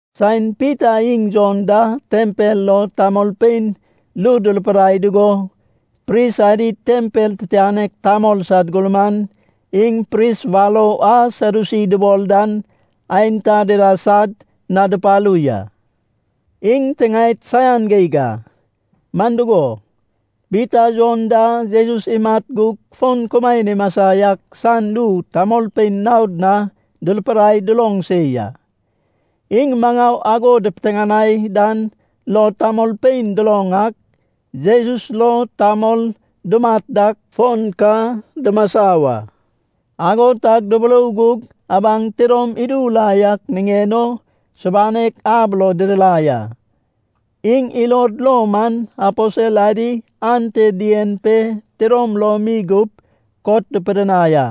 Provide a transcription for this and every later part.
Saen Pita iŋ Jon da tempel lo tamolpein ru durupidai dugo, pris adi, tempel titianek tamol sad gurman, iŋ pris warou a Sadyusi dubol dan aenta dida sad na dupalu ya. Iŋ tiŋaed saian geig a. Man dugo, Pita Jon da Jesus imat gug fon kumaen imasa yak san ru tamolpein naod na durupidai duloŋ se ya. Iŋ maŋau ago dupiteŋanai dan lo tamolpein duloŋ ak, Jesus lo tamol dumat dak, fon ka dumasa wa. Ago tag duburou gug abaŋ tidom idu la yak niŋen o subanek ab lo didirai a. Iŋ ilod lo man aposel adi ante dien pe tidom lom mi gup kot dupidinai a.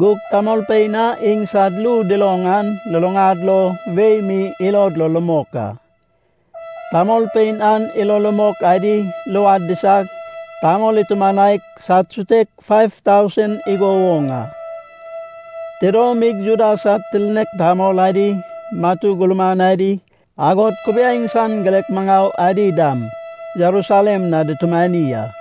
Gug tamolpein a iŋsad ru duloŋ an luluŋad lo wei mi ilod lo rumok a. Tamolpein an ilo rumok adi luad disag, tamol itumanaig sad sutek faiv tausen igo woŋ a. Tidomig Juda sad tirnek tamol adi, matu gurman adi, agod kubiaeŋ san girek maŋau adi dam Jerusalem na dutumani a.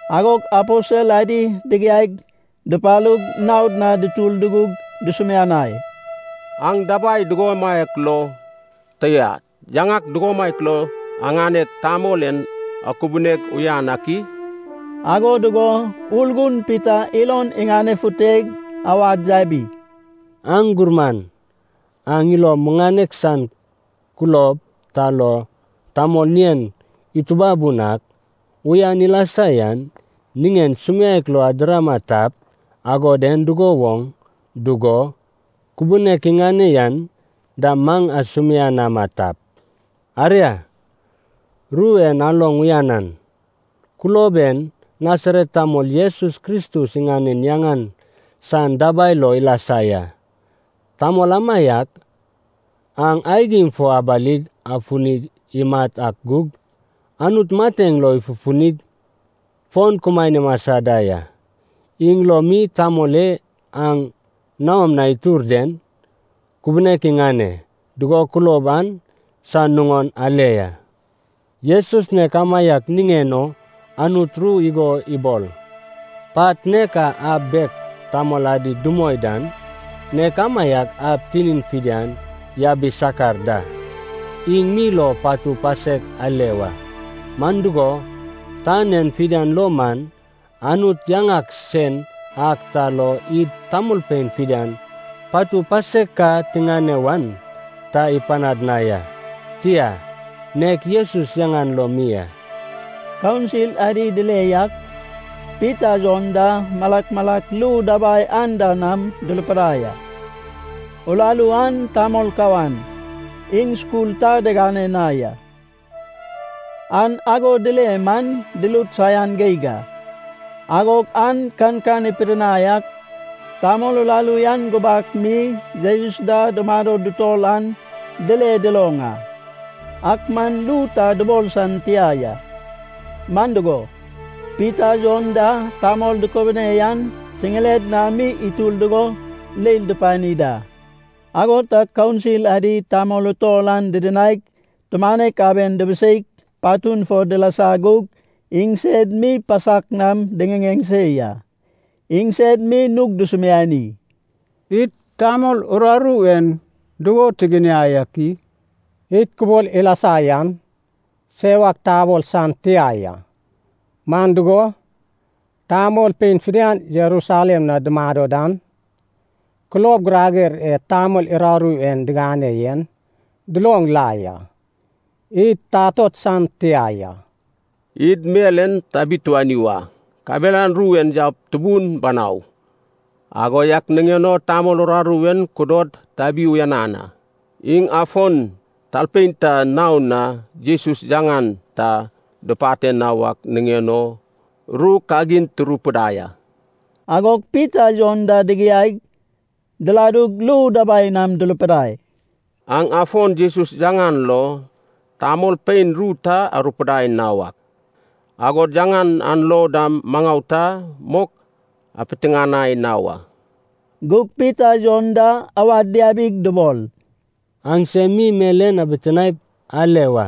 Agog aposel adi digiaig dupalug, naod na dutur dugug dusumianai, “Aŋ dabai dugomaiak lo, tia, yaŋak dugomaiak lo aŋaneg, tamol en akubuneg uyan ak i?” Ago dugo Urgun Pita ilon iŋanefuteg awad yabi, “Aŋ gurman, aŋ ilo muŋanek san kulob ta lo tamol ŋien itubabun ak uyan ilasa yan niŋen sumiaek lo adirama tap, agod en dugo woŋ dugo kubunek iŋane yan dam maŋ asumianama tap, aria, ru en aloŋ uyanan. Kulob en Nasaret tamol Jesus Kristus iŋanen yaŋan san dabai lo ilasa ya. Tamol amaiak aŋ aigim fo abalig afuni imat ak gug, Anut mateŋ lo ifufunig fon kumaen imasa da ya. Iŋ lo mi tamol e aŋ naom na itur den kubunek iŋane dugo kulob an san nuŋon ale ya. Jesus nek amaiak niŋen o Anut ru igo ibol, ‘Pat nek a ab bek tamol adi dumoi dan, nek amaiak ab tinin fidian yabi sakar da.’ Iŋ mi lo patu pasek ale wa. Man dugo, tan en fidian lo man Anut yaŋak sen ak ta lo id tamolpein fidian patu pasek ka tiŋane wan ta ipanad na ya, tia, nek Jesus yaŋan lo mi a.” Kaunsil adi dile yak, Pita Jon da malak malak ru dabai anda nam durupidai a, uraru an tamol kawan, iŋ skul ta digane na ya. An ago dile man durut saian geig a. Agog an kankan ipidinai ak, tamol uraru an gubak mi Jesus da dumado dutor an dile duloŋ a. Ak man ru ta dubol san tia ya. Man dugo, Pita Jon da tamol dukubune yan siŋired na mi itur dugo leil dupani da. Ago tag kaunsil adi tamol utol an didinaig, tumanek aben dubiseig patun fo dilasa gug iŋsed mi pasak nam diŋiŋeŋ se ya. Iŋsed mi nug dusumiani, “Id tamol uraru en dugo tiginiai ak i? Id kubol ilasa yan sewak tabol san tia ya, man dugo, tamolpein fidian Jerusalem na dumado dan kulob girager e tamol uraru en digane yen duloŋ la ya. Id tatot san tia ya. Id mel en tabituani wa, kabelan ru en yaup tubun banau. Ago yak niŋen o tamol uraru en kudod tabi uyanan a. Iŋ afon talpein ta naon na Jesus yaŋan ta dupate na wak niŋen o ru kagin turupidai a.” Agog Pita Jon da digiaig, diladug ru dabai nam durupidai, “Aŋ afon Jesus yaŋan lo tamolpein ru ta arupidai na wak, agod yaŋan an lo dam maŋau ta mok apiteŋanai na wa.” Gug Pita Jon da awad diabig dubol, “Aŋsem mi mel en abitinaep ale wa.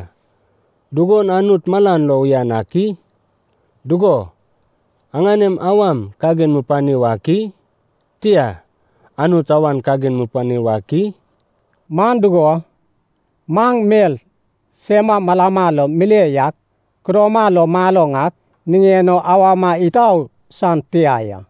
Dugon Anut malan lo uyan ak i? Dugo, aŋanem awam kagin mupani wak i? Tia, Anut awan kagin mupani wak i? Man dugo, maŋ mel sema malama lo mile yak kudoma lo maloŋ ak niŋen o awama itau san tia ya.”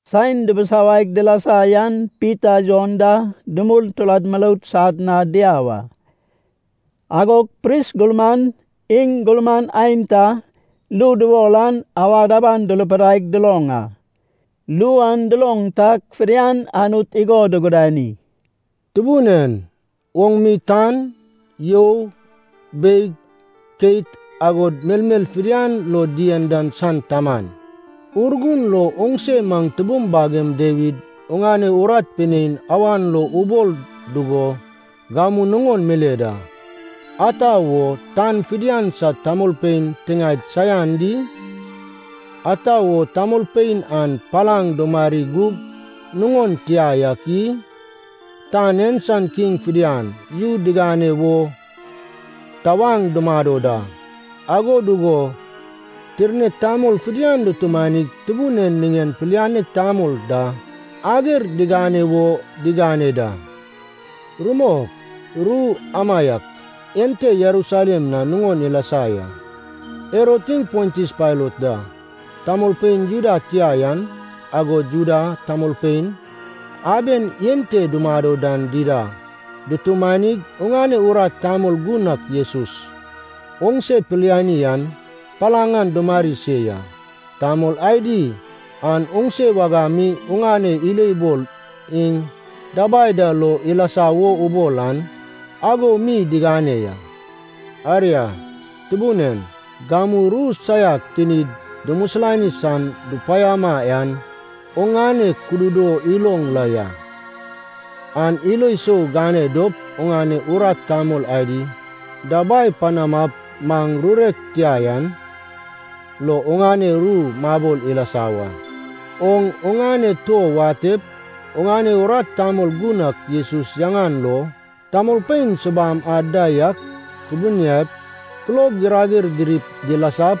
Saen dubusawaig dilasa yan Pita Jon da dumul turad muroud sad na diau a. Agog pris gurman, iŋ gurman aenta, ru dubol an awad aban durupidaig duloŋ a. Ru an duloŋ tag fidian Anut igo dugudani, “Tubun en, oŋ mi tan, you, beig, keit, agod mel mel fidian lo dien dan san Taman. Urgun lo oŋse maŋ tubum bagem Dawid oŋane urat pinein awan lo ubol dugo gamu nuŋon mile da. ‘Ata wo tan fidian sad tamolpein tiŋaed saian di? Ata wo tamolpein an palaŋ dumari gug nuŋon tia yak i? Tan en san kiŋ fidian yu digane wo tawaŋ dumado da, ago dugo tirnek tamol fidian dutumanig, Tubun en iŋanen Pilianek Tamol da ager digane wo digane da.’ Rumok, ru amaiak ente Jerusalem na nuŋon ilasa ya. Herod iŋ Pontius Pailat da, tamolpein Juda tia yan agod Juda tamolpein aben ente dumado dan dida dutumanig, oŋane urat tamol gun ak Jesus oŋse piliani an, palaŋ an dumari se ya. Tamol adi an oŋse wagam mi oŋane ilobol iŋ dabai da lo ilasa wo ubol an, ago mi digane ya. Aria, Tubun en, gamu ru saiak tinid dumisilani san dupaiama an oŋane kududo iloŋ la ya. An ilo sou gane dop oŋane urat tamol adi dabai panamap maŋ rurek tia yan lo oŋane ru mabol ilasa wa. Oŋ oŋane tuo watep oŋane urat tamol gun ak Jesus yaŋan lo, tamolpein subam ad da yak kubuniaip, kulob girager dirip dilasap,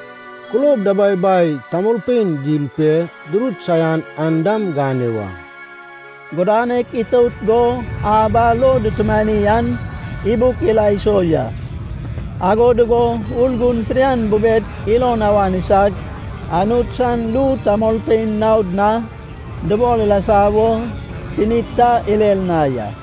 kulob dababai tamolpein dil pe durut saian an dam gane wa.” Gudanek itout go ab a lo dutumani an ibuk ila iso ya. Ago dugo Urgun fidian bubed ilon awan isag, Anut san ru tamolpein naod na dubol ilasa wo tinid ta irer na ya.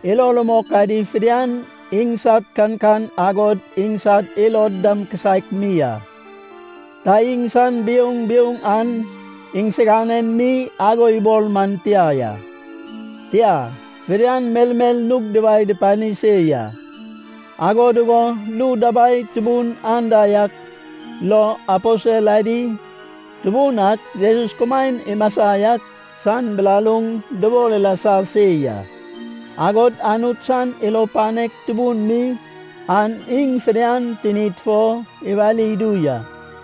Ilo rumok adi fidian iŋsad kankan agod iŋsad ilod dam kisaek mi a. Ta iŋsan biouŋ biouŋ an iŋsiganen mi ago ibol man tia ya. Tia, fidian melmel nug duwae dupani se ya. Ago dugo ru dabai tubun anda yak lo, aposel adi Tubun ak Jesus kumaen imasa yak san bilaluŋ dubal ilasa se ya. Agod Anut san ilo panek tubun mi an iŋ fidian tinid fo iwali idu ya.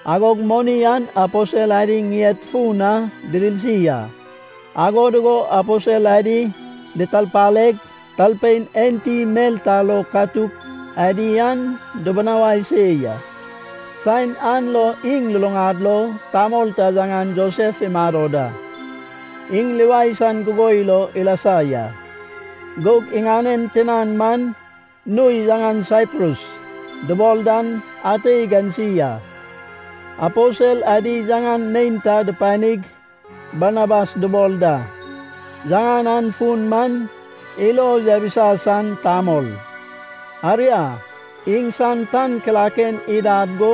Agog moni an aposel adi ŋied fun na didirsi a, ago dugo aposel adi ditarpaleg talpein enti mel ta lo katuk adi an dubinawai se ya. Saen an lo iŋ luluŋad lo tamol ta yaŋan Josef imado da. Iŋ Livai san gugoi lo ilasa ya, gug iŋanen tinan man nui yaŋan Saiprus dubol dan ante igansi a. Aposel adi yaŋan neinta dupanig Barnabas dubol da. (Yaŋan an fun man, Ilo Yabisa San Tamol.) Aria, iŋsan tan kilaken idad go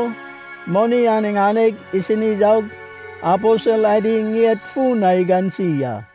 moni an iŋaneg isini yaug aposel adi ŋied fun na igansi a.